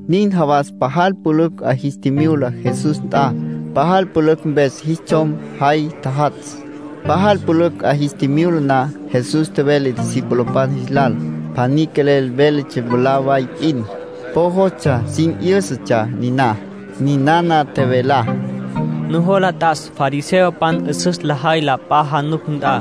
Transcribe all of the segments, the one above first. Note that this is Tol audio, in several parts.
Nin jawas pajal pülücj 'a jis tjimyula Jesús nt'a. Pajal pülücj mpes jis tsjom jay tjajatsj. Pajal pülücj 'a jis tjimyula na, Jesús tjevele discipulopan jis lal. Pjaní quelel véletsja mwalá way p'in. Po jostsja sin 'yǘsatsja niná. Ninana tjevelá: “Nujola t'as fariseopan 'üsüs lajay la p'a januc nt'a,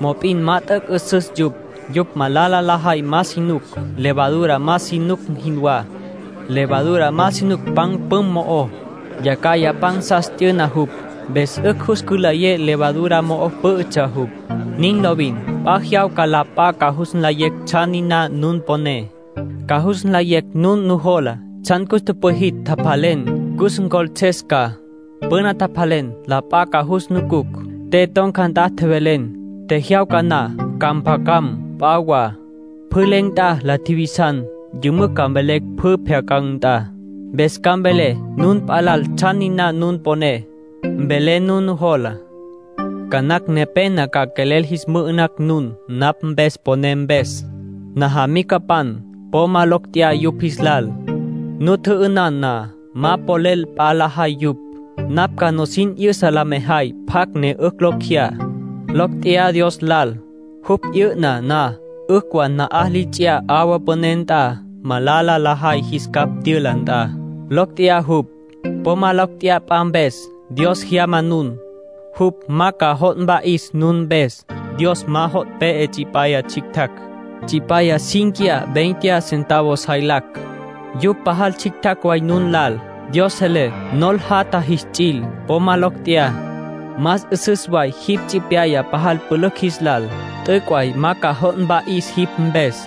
mop'in ma t'üc' 'üsüs yupj. Yupj malala lajay ma si nuc, levadura ma si nuc jinwá. Levadura ma si nuc pan püm mo'ó. Yacjaya pansas t'yüna jupj, mpes 'ücj jus cülayes levadura mo'o pǘ'ütsja jupj. Nin lovin. P'a jyawca la p'a ca jus nlayecj tsjan niná nun poné, ca jus nlayecj nun nujolá. Tsjan cus tüpwijitj, tjapjalen, cus ncjoltses ca. Püna tjapjalen, la p'a ca jus nucucj. Te ton̈ca nt'a tjevelen, tjejyawca na ca mpjacam p'a wa. Pjü len̈ nt'a la tjivisan, yümücj ca mvelecj pjü pjyacan̈ nt'a. Mpes ca mvelé nun p'a lal tsjan niná nun poné, mvelé nun nujolá. ”Ca nacj nepena ca quelel jis mü'ü'nacj nun, napj mpes poné mpes. Najamicapan, po ma locj tjeyá yupj jis lal. Nu tjü'ünan na, ma polel p'a lajay yupj. Napj ca nusin 'yüsa la mejay pjacj ne 'ücj locj jeyá: locj tjeyá Dios lal. Jupj 'yü'na na, 'ücj wa na'aj li ts'iyá 'awa püné nt'a, malala lajay jis capj tyüla nt'a. ¡Locj tjeyá jupj! ”Po ma locj tjeyá p'a mpes. Dios jyama nun. Jupj ma ca jo' mpa'is nun mpes. Dios ma jo' pe'e tsipyaya tsjictjacj. Tsipyaya cínquiya veinte centavos jaylacj. Yupj pajal tsjictjacj way nun lal. Dios selé nol jatja jits'il. Po ma lecj tjeyá. Más 'üsüs way jipj tsipyaya pajal pülücj jis lal. T'üc' way ma ca jo' mpa'is jipj mpes.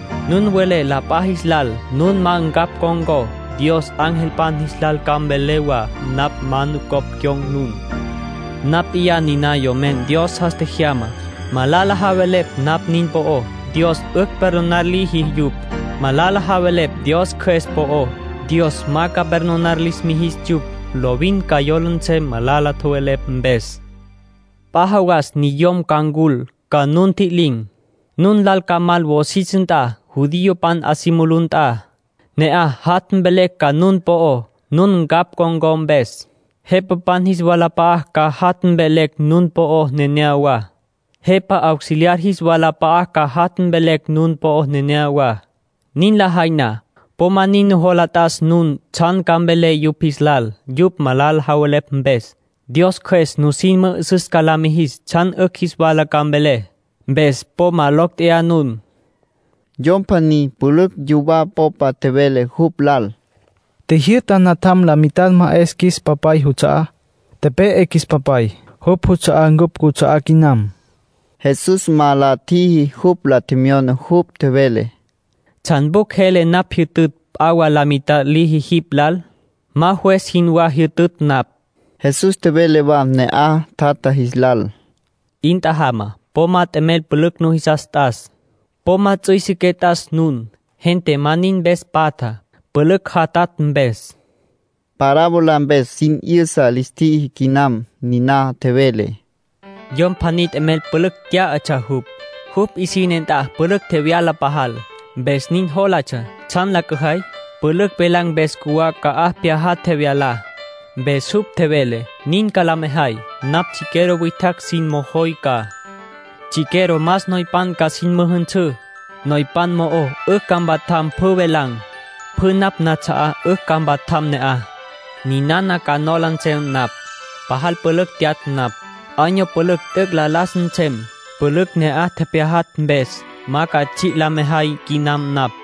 Nun welé la p'a jis lal nun ma ncapj con̈có, Dios angelpan jis lal ca mvelé wa napj ma nucopj cyon̈ nun. ”Napj p'iyá niná Yomen Dios jas tjejyamá. Malala javelepj napj nin po'ó, Dios 'ücj perdonar liji yupj. Malala javelepj Dios Cjües po'ó, Dios ma ca perdonar lis mijis yupj. Lovin ca jola nsem malala tjowelepj mpes. ”P'a jawas niyom ca ncul, ca nu ntji'lin̈. Nun lal ca mal wosis nt'a, judiopan 'a si mulú nt'a. Ne'aj jat' mvelecj ca nun po'ó, nun ncapj con̈có mpes. Jepapan jis walap'a'a ca jat' mvelecj nun po'ó neneyawá. Jepa auxiliar jis walap'a'a ca jat' mvelecj nun po'ó neneyawá. Nin lajay na, po ma nin nujola t'as nun tsjan ca mvelé yupj jis lal yupj malala tjowelepj mpes. Dios Cjües nusin mü'üsüs ca la mijis tsjan 'ücj jis wala ca mvelé. Mpes po ma locj tjeyá nun.” Yom pjaní pülücj yuwá popa tjevele jupj lal: —Tjijyü'ta natjam la mitad ma 'es qjuis papay juts'a'á. Tepe'e qjuis papay. Jupj juts'a'á ncupj cuts'a'á quinam. Jesús ma la tjiji jupj la tjemyoná. Jupj tjevele: —¿Tsjan pjucj jele napj jyütütj p'a wa la mitad liji jipj lal? Ma juez jinwá jyütütj napj. Jesús tjevele wa ne'aj tjatja jis lal: —'In tjajama. Po ma t'emel pülücj nujisas t'as. Po ma ts'üisiqué t'as nun. Gente ma nin mpes patja, pülücj jatatj mpes. Parábola mpes sin 'yüsa lis tjiji quinam niná. Tjevele: —Yom pjaní t'emel pülücj tyá'atsja jupj. Jupj 'isine nt'a pülücj tjevyala pajal. Mpes nin jólatsja: ‘¿Tsjan la cüjay? Pülücj tjevelan̈ mpes cjuwá ca'aj pyajatj tjevyalá.’ Mpes jupj tjevele: ‘Nin ca la mejay: napj chiquero witjacj sin mojoy ca. Chiquero más noypan ca sin müjünsǘ. Noypan mo'o 'ücj ca mpajatj pjü tjevelan̈. Pjü napj nats'a'á 'ücj ca mpajatj ne'aj. Ninana ca nola nsem napj: “Pajal pülücj tyatj napj. Año pülücj t'üc' la las nsem, pülücj ne'aj tepyajatj mpes. Ma ca tsji' la mejay quinam napj.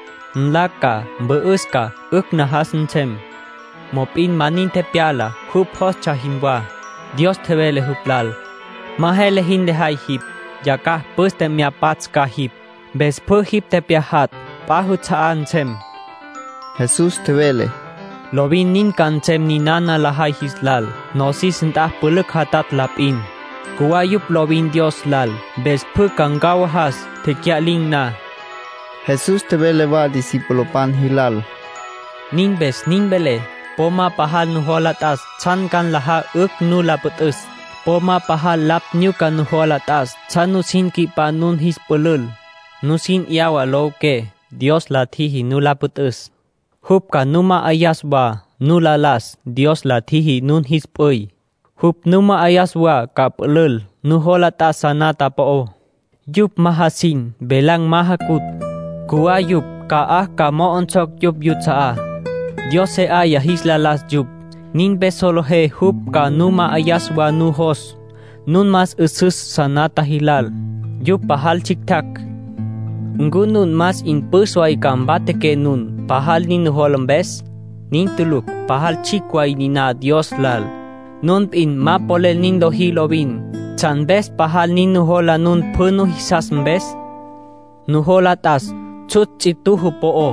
Nla ca. Mü'üs ca. 'Ücj najas nsem.” ’ Mop'in ma nin tepyala, jupj jólatsja jinwá. Dios tjevele jupj lal: ‘Ma jele jin lejay jipj. Yacjaj püste mya pats' ca jipj. Mpes pjü jipj tepyajatj p'a juts'a'á nsem.’ Jesús tjevele: —Lovin nin ca nsem ninana lajay jis lal. Nosis nt'a pülücj jatatj la p'in. Cjuwá yupj lovin Dios lal, mpes pjü ca ncawajas, tecya'lin̈ na. Jesús tjevele wa discipulopan jilal: —Nin mpes nin velé, po ma pajal nujola t'as tsjan ca nlajá 'ücj nu la püt'üs. Po ma pajal lapj nyuca nujola t'as tsjan nusin nqui'pá nun jis pülül, nusin 'yawa lowiqué. Dios la tjiji nu la püt'üs. Jupj ca nu ma'ayas wa nu lo las. Dios la tjiji nun jis p'üy. Jupj nu ma'ayas wa ca pülül. Nujola t'as sanata po'ó. Yupj ma jasin. Velan̈ ma jacutj. Cjuwá yupj ca'aj ca mo'onsocj yupj yuts'a'á. Dios se 'aya jis la las yupj. Nin mpes solejé jupj ca nu ma'ayas wa nun nujos. Nun más 'üsüs sanata jilal. Yupj pajal tsjictjacj. ”¿Ncu nun más 'in püs way ca mpatjaqué nun, pajal nin nujola mpes? Nin tulucj. Pajal tsjicj way niná Dios lal; nun p'in ma polel nin lojí lovin. ¿Tsjan mpes pajal nin nujola nun pjü nujisas mpes? Nujola t'as tsjutsj ts'ituju po'ó.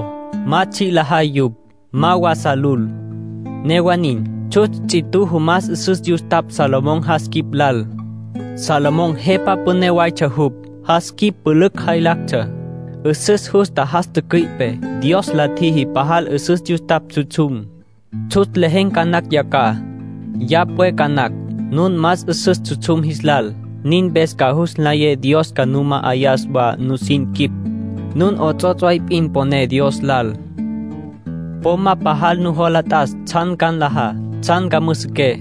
Ma tsji' lajay yupj. Ma wa sa lul. Newa nin, tsjutsj ts'ituju más 'üsüs yustapj Salomón jas quip lal. Salomón jepa püné waytsja jupj. Jas quip pülücj jaylactsja. 'Üsüs justa jas tücüi'pe. Dios liji pajal 'üsüs yustapj tsjutsjum. Tsjutsj lejen̈ ca nacj yacjaj. Ya pwe ca nacj. Nun más 'üsüs tsjutsjum jis lal. Nin mpes ca jus nlayé Dios ca nu ma'ayas wa nusin quip. Nun 'ots'ots' way p'in poné Dios lal. ”Po ma pajal nujola t'as tsjan ca nlajá, tsjan ca müsiqué.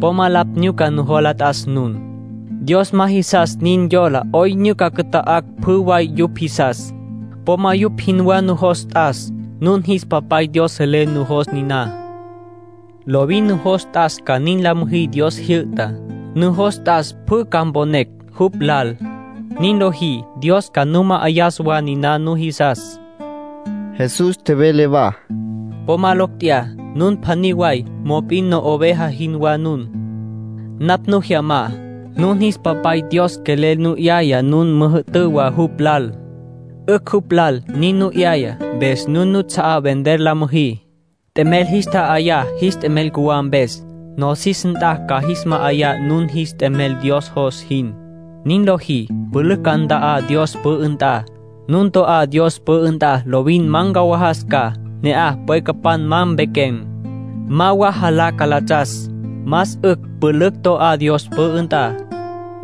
Po ma lapj nyuca nujola t'as nun. Dios ma jisas nin yola 'oyn nyuca cüta'acj pjü way yupj jisas. Po ma yupj jinwá nujos t'as. Nun jis Papay Dios selé nujos niná. Lovin nujos t'as ca nin la müjí Dios jyü'tá. Nujos t'as pjü ca mponecj jupj lal. Nin lojí, Dios ca nu ma'ayas wa niná nujisas. Jesús tjevele wa: —Po ma locj tjeyá. Nun pjaní way, mop'in no'oveja jinwá nun. Napj nu jyamá. Nun jis Papay Dios quelel nu 'yaya nun müjü'tǘ wa jupj lal. 'Ücj jupj lal nin nu 'yaya. Mpes nun nuts'a'á vender la müjí, t'emel jis tja'ayá jis t'emel cjuwá mpes. Nosis nt'a ca jis ma'ayá nun jis t'emel Dios jos jin. Nin lojí, pülücj ca nta'á Dios pü'ü nt'a. Nun to'á Dios pü'ü nt'a lovin ma ncawajas ca. Ne'aj pwecapan ma pequen̈, ma wa jalá calatsas. Más 'ücj pülücj to'á Dios pü'ü nt'a.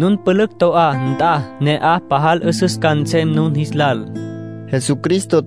Nun pülücj to'á nt'a, ne'aj pajal 'üsüs ca nsem nun jis lal —nin tjevele Jesucristo.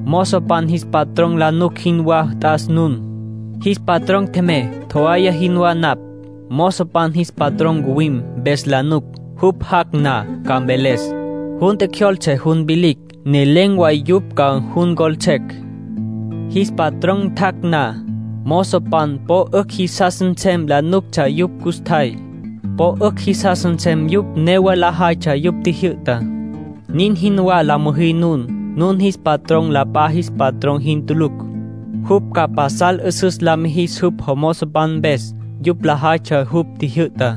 Mozopan jis patrón la nuc jinwá t'as nun. Jis patrón tjemey, tjowaya jinwá napj. Mozopan jis patrón ncuwim, mpes la nuc. Jupj jac' na, ca mveles: ‘Jun tjecjyoltse jun vilicj’, ne len̈ way yupj ca jun ncjoltsecj. Jis patrón tjac' na, mozopan po 'ücj jisas nsem la nuctsja yupj custjay. Po 'ücj jisas nsem yupj newa lajaytsja jupj tjijyü'tá. Nin jinwá la müjí nun. Nun jis patrón la p'a jis patrón jin tulucj. Jupj ca pasal 'üsüs la mijis jupj jomozopan mpes, yupj lajaytsja jupj tjijyü'tá.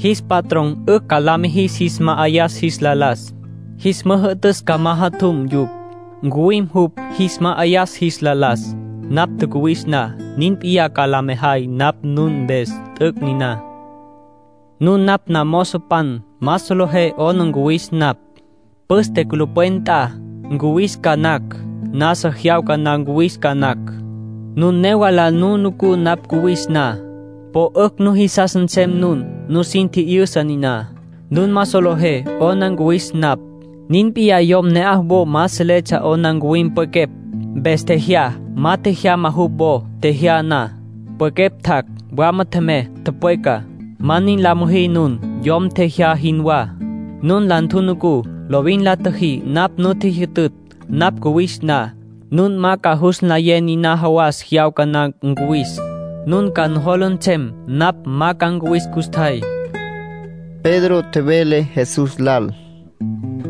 Jis patrón 'ücj ca la mijis jis ma'ayas jis la las. Jis müjü'tüs ca majatjum yupj. Ncuwim jupj, jis ma'ayas jis la las. Napj tjacuwis na, nin p'iyá ca la mejay napj nun mpes. T'üc' niná. ”Nun napj namozopan. Ma solejé 'ona ncuwis napj. Püste culupwen nt'a ncuwis ca nacj. Nasa jyawca na ncuwis ca nacj. Nun newa la nu nucú napj cuwis na, po 'ücj nujisas nsem nun. Nusin tji'yüsa niná: nun ma solejé 'ona ncuwis napj. Nin p'iyá yom ne'aj wo ma seletsja 'ona ncuwim pwequepj, mpes tjejyá, ma tjejyama jupj wo. Tjejyá na, pwequepj tjac', wama tjemey, tüpweca. Ma nin la müjí nun, yom tjejyá jinwá. Nun la ntjunucú, lovin la tjüjí napj nu tjijyütütj. Napj cuwis na, nun ma ca jus nlayé niná jawas jyawca na ncuwis. Nun ca nujola nsem napj ma ca ncuwis custjay —tjevele Jesús. Pedro tjevele Jesús lal: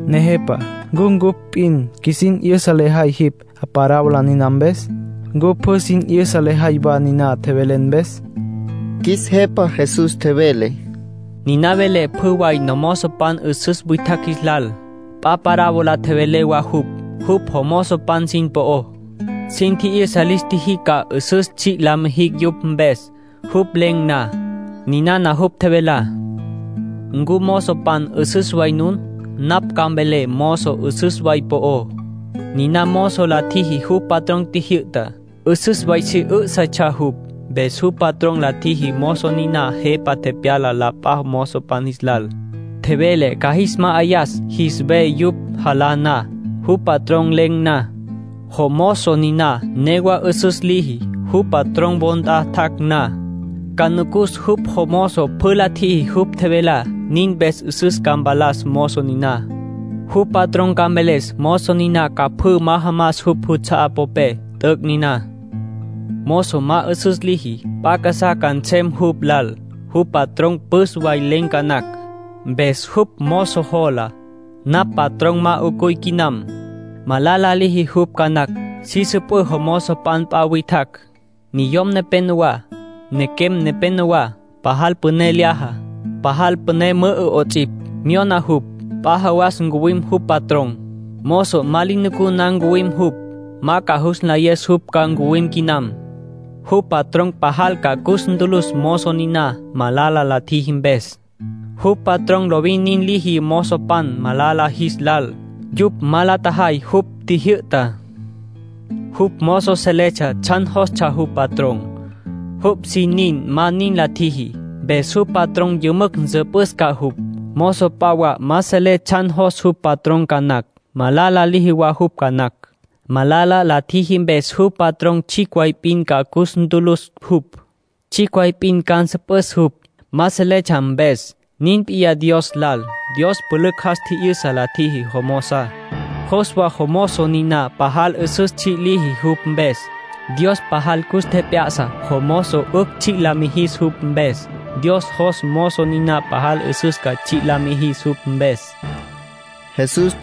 —Nejepa ¿ncu ncupj p'in qjuisin 'yüsa lejay jipj, parábola niná mpes? ¿Ncu pjü sin 'yüsa lejay wa nin tjevelen mpes? Qjuis Jepa Jesús tjevele: —Niná velé pjü way nomozopan 'üsüs witjacj jis lal. P'a parábola tjevele wa jupj jupj jomozopan sin po'ó. (Sin tji'yüsa lis tjiji ca 'üsüs tsji' la mijicj jupj mpes, jupj len̈ na.) Ninana jupj tjevelá: —¿Ncu mozopan 'üsüs way nun? Napj ca mvelé mozo 'üsüs way po'ó. Niná mozo la tjiji jupj patrón tjijyü'tá. 'Üsüs way si 'üsütsja jupj. Mpes jupj patrón la tjiji mozo niná jepa tepyala la p'a mozopan jis lal. Tjevele ca jis ma'ayas jis ve yupj jalá na. Jupj patrón len̈ na, jomozo niná newa 'üsüs liji. Jupj patrón wo nt'a tjac' na, ca nucus jupj jomozo pjü la tjiji jupj tjevelá. Nin mpes 'üsüs ca mpalas mozo niná. Jupj patrón ca mveles mozo niná ca pjü majamas jupj juts'a'á popé. T'üc' niná. ”Mozo ma 'üsüs liji, p'a casá ca nsem jupj lal. Jupj patrón püs way len̈ ca nacj. Mpes jupj mozo jola: ‘Napj patrón ma 'ucuy quinam’. Malala liji jupj ca nacj. Si süpǘ mozopan p'a witjacj, niyom nepenowá, nequem nepenowá. Pajal püné lyaja, pajal püné mü'ü 'ots'ipj. Myona jupj. P'a jawas ncuwim jupj patrón. Mozo ma li nucú na ca ncuwim jupj. Ma ca jus nlayes jupj ca ncuwim quinam. Jupj patrón pajal ca cus ntülüs mozo niná, malala la tjiji mpes. Jupj patrón lovin nin liji mozopan malala jis lal, yupj ma la tjajay jupj tjijyü'tá. Jupj mozo seletsja tsjan jostsja jupj patrón. Jupj sin nin ma nin la tjiji, mpes jupj patrón yümücj nsüpüs ca jupj. Mozo p'a wa ma selé tsjan jos jupj patrón ca nacj. Malala liji wa jupj ca nacj. Malala la tjiji mpes jupj patrón tsjicj way p'in ca cus ntülüs jupj. Tsjicj way p'in ca nsüpüs jupj, ma seletsja mpes. Nin p'iyá Dios lal. Dios pülücj jas tji'yüsa la tjiji jomozá, jos wa jomozo niná pajal 'üsüs tsji' liji jupj mpes. Dios pajal cus tjep'ya'sa jomozo 'ücj tsji' la mijis jupj mpes, Dios jos mozo niná pajal 'üsüs ca tsji' la mijis jupj mpes —nin tjevele Jesús.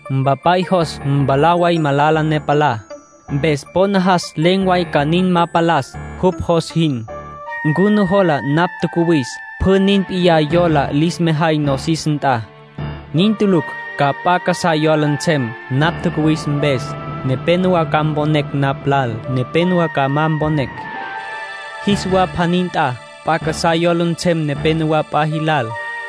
Mpapay jos mwalá way malala ne palá, mpes po najas len̈ way ca nin ma palas, jupj jos jin. ¿Ncu nujola napj tjacuwis pjü nin p'iyá yola lis mejay nosis nt'a? Nin tulucj. Ca p'a casá yola nsem, napj tjacuwis mpes. (Nepénowa ca mponecj napj lal. Nepénowa ca ma mponecj.) Jis wa pjaní nt'a, p'a casá yola nsem nepenowá p'a jilal.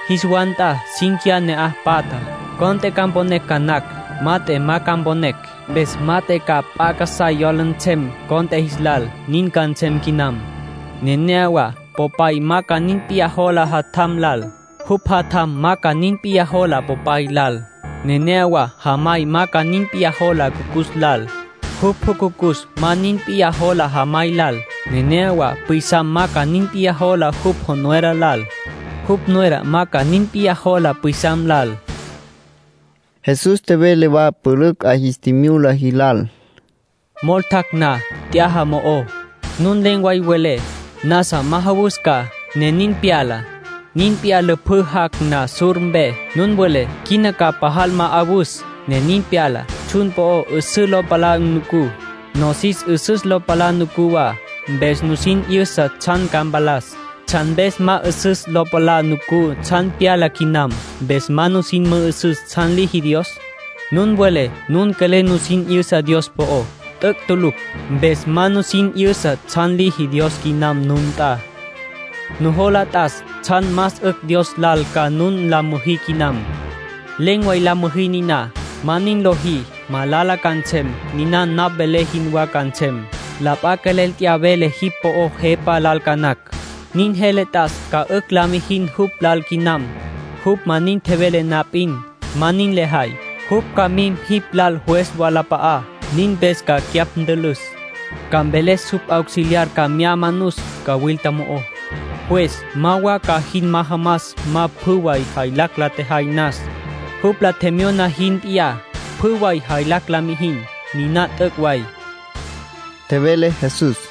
Jis wa nt'a cínquiya ne'aj patja, cont'e ca mponecj ca nacj; mat'e ma ca mponecj. Mpes mat'e ca p'a casá yola nsem cont'e jis lal. Nin ca nsem quinam. Nenéyawa popay ma ca nin p'iyá jola jatjam lal; jupj jatjam ma ca nin p'iyá jola popay lal. Nenéyawa jamay ma ca nin p'iyá jola jucucus lal; jupj jucucus ma ca nin p'iyá jola jamay lal. Nenéyawa pwisam ma ca nin p'iyá jola jupj nuera lal; jupj nuera ma ca nin p'iyá jola pwisam lal. Jesús tjevele wa pülücj 'a jis tjimyula jilal: —Mol tjac' na t'yaja mo'ó, nun len̈ way welé: ‘Nasa majawus ca’, ne nin pyala. Nin p'iyá lüpjǘ jac' na sur mpe, nun welé: ‘Quina ca pajal ma'awus’, ne nin pyala. Tsjun po'ó 'üsüs lo palá nucú, nosis 'üsüs lo palá nucú wa, mpes nusin 'yüsa tsjan ca mpalas. ¿Tsjan mpes ma 'üsüs lo palá nucú tsjan pyala quinam, mpes ca nusin mü'üsüs tsjan liji Dios? Nun welé nun quelel nusin 'yüsa Dios po'ó. T'üc' tulucj. Mpes ma nusin 'yüsa tsjan liji Dios quinam nun nt'a. ”Nujola t'as tsjan más 'ücj Dios lal ca nun la müjí quinam. Len̈ way la müjí niná. Ma nin lojí, malala ca nsem, niná napj velé jinwá ca nsem. La p'a quelel t'ya vele jipj po'ó jepa lal ca nacj. Nin jele t'as ca 'ücj la mijin jupj lal quinam, jupj ma nin tjevele na p'in. Ma nin lejay, jupj ca mim jipj lal juez wolap'a'á. Nin mpes ca cyapj ntülüs. Ca mveles jupj auxiliar ca mya manus cawilta mo'ó. Juez ma wa ca jin majamas ma pjü way jaylacj la tjejay nas, jupj la tjemyona jin p'iyá. Pjü way jaylacj la mijin. Niná t'üc' way —tjevele Jesús.